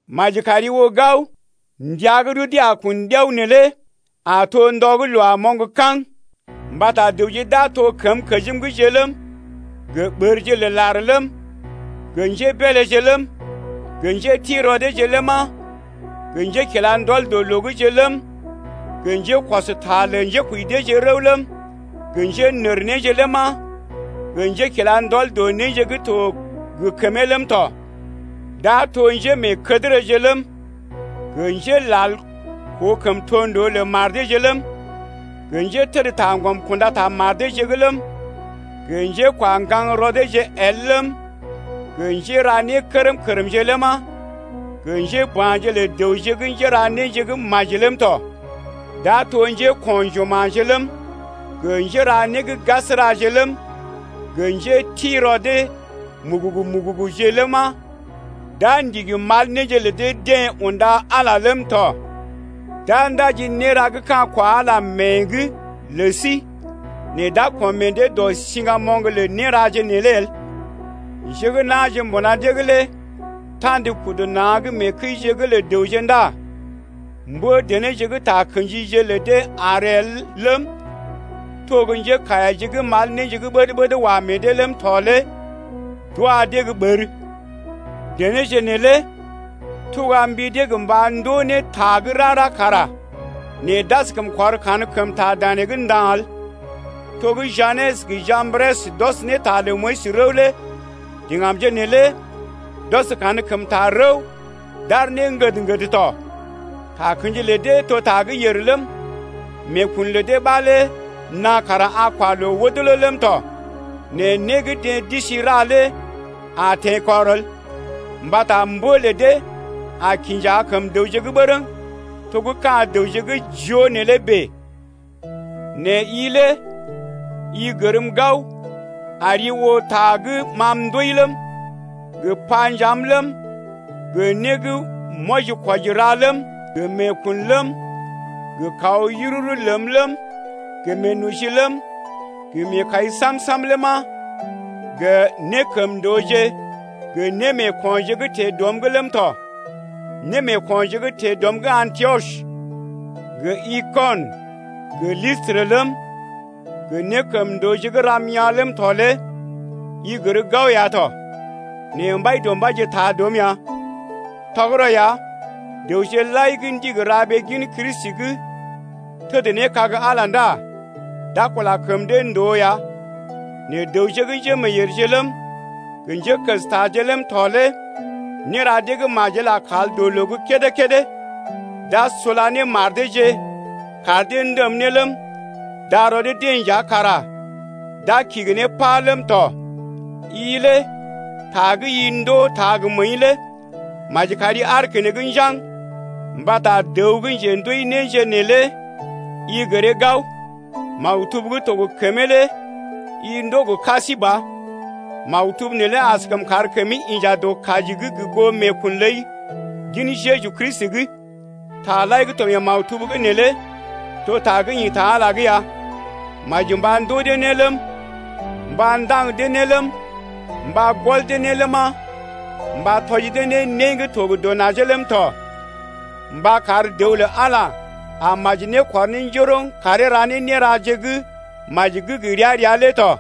Maji kari oo gao, ndəa gə́ rudee a kun ɗiao neelé a to ndɔ gə́ loo a moŋg kaŋ. Mbata dəwje d’a to kəmkəjimje’g ləm, gə ɓərje lə lar ləm, gə njébeeleje ləm, gə njéti rɔ deeje ləma, gə njékilandɔl dɔ loo’gje ləm, gə njékɔs ta lə njékoji deeje rəw ləm, gə njénərnéje ləma, gə njékila ndɔl dɔ néje gə́ to gə kəmee ləm tɔ. D’a to njémeekədərəje ləm, gə njélal koo kəmtondoo lə mar deeje ləm, gə njétədtaŋgɔm kunda ta mar deeje’g ləm, gə njékwaŋgaŋ rɔ deeje el ləm, gə njéra nékərm-kərmje ləma, gə njéba̰je lə dəwje gə́ njéra néje gə́ maji ləm tɔ. D’a to njéko̰ juma̰je ləm, gə njéra né gə́ gasəraje ləm, gə njéti-rɔ dee mugugu-muguguje ləma, d’a ndigi mal néje lə dee-deḛ unda Ala ləm tɔ. D’a ndaji néra gə́ ka̰ kwa Ala mée’g lə sí nɛ d’a kɔm meḛ dee dɔ siŋgamoŋ lə néraje neelé el. Njé gə́ na̰je mbuna dee’g lé ta̰d kudu na̰’g mee kəije’g lə dəwje ndá mbə-denéje gə́ takə̰jije lə dee àr el ləm, to gə́ njékaiyaje gə́ mal néje gə́ ɓəd-ɓəd wa meḛ dee ləm tɔ lé d’wa dee gə́ ɓər. Denéje neelé tuga mbi dee gə mba ndoo ne ta gə́ rara kara nɛ d’askəm kɔr kankəmta danee’g nda̰ el. To gə́ Janes gə Jambres d’ɔs ta lə Moyis rəw lé deḛ kara d’ɔs kankəmta rəw d’aar ne ŋgəd-ŋgəd tɔ. Takə̰ji lə dee to ta gə́ yèr ləm, meekun lə dee ɓa lé naa kara a kwa loo wodolo ləm tɔ. Nɛ né gə́ deḛ d’isi ra lé a teḛkɔr el, mbata mbə lə dee a kinja kəm dəwje’g bərəŋ to gə́ ka̰ dəwje gə́ joo neelé bèe. Nɛ i lé i gərm gao ari oo ta gə́ ma m’ndooi ləm, gə panjaam ləm, gə né gə́ m’wɔji-kwɔji ra ləm, gə meekun ləm, gə kaw yururu ləm, gə meenoji ləm, gə meekai Sam ləma, gə nékəmndooje gə némeekonje gə́ teḛ dɔm’g ləm tɔ. Némeeko̰je gə́ teḛ dɔm’g Antiɔs, gə Ikɔnə, gə Listrə ləm, gə nékəmndooje gə́ ram yaa̰ ləm tɔ lé i gər gao ya tɔ. Nɛ Mbaidɔmbaije taa dɔm ya. Tɔgərɔ ya, dəwje lai gə́ ndigi ra ɓee gin Kristi’g təd ne kag Ala ndá d’a kula kəm dee ndòo ya. Nɛ dəwje gə́ njémeeyèrje ləm, gə njékəstaje ləm tɔ lé néra dee gə́ majel a kal dɔ loo gə́ kédé-kédé. D’a sula ne mar deeje kar dee ndəm ne ləm, darɔ dee-deḛ nja kara d’a kigi ne pá ləm tɔ. I lé ta gə́ i ndoo, taa gə məəi lé maji kari aar keneŋ njaŋg mbata dəw gə́ njendooi néje neelé i gəree gao. Maktub gə́ to gə kəmee lé i ndoo gə ka sí ba, maktub neelé askəm kar kəmi inja dɔ kaji’g gə goo meekun ləi gin Jeju Kristi’g. Taje lai gə́ to mee maktub’g neelé to ta gə́ ḭ ta Ala’g ya, maji mba ndoo dee ne ləm, mba ndaŋg dee ne ləm, mba gɔl dee ne ləma, mba tɔji dee ne né gə́ to gə dɔ najee ləm tɔ mba kar dəw lə Ala a maji ne kɔr njoroŋ ləm karee ra ne néraje gə́ maji gə́ gə ria-ria lé tɔ.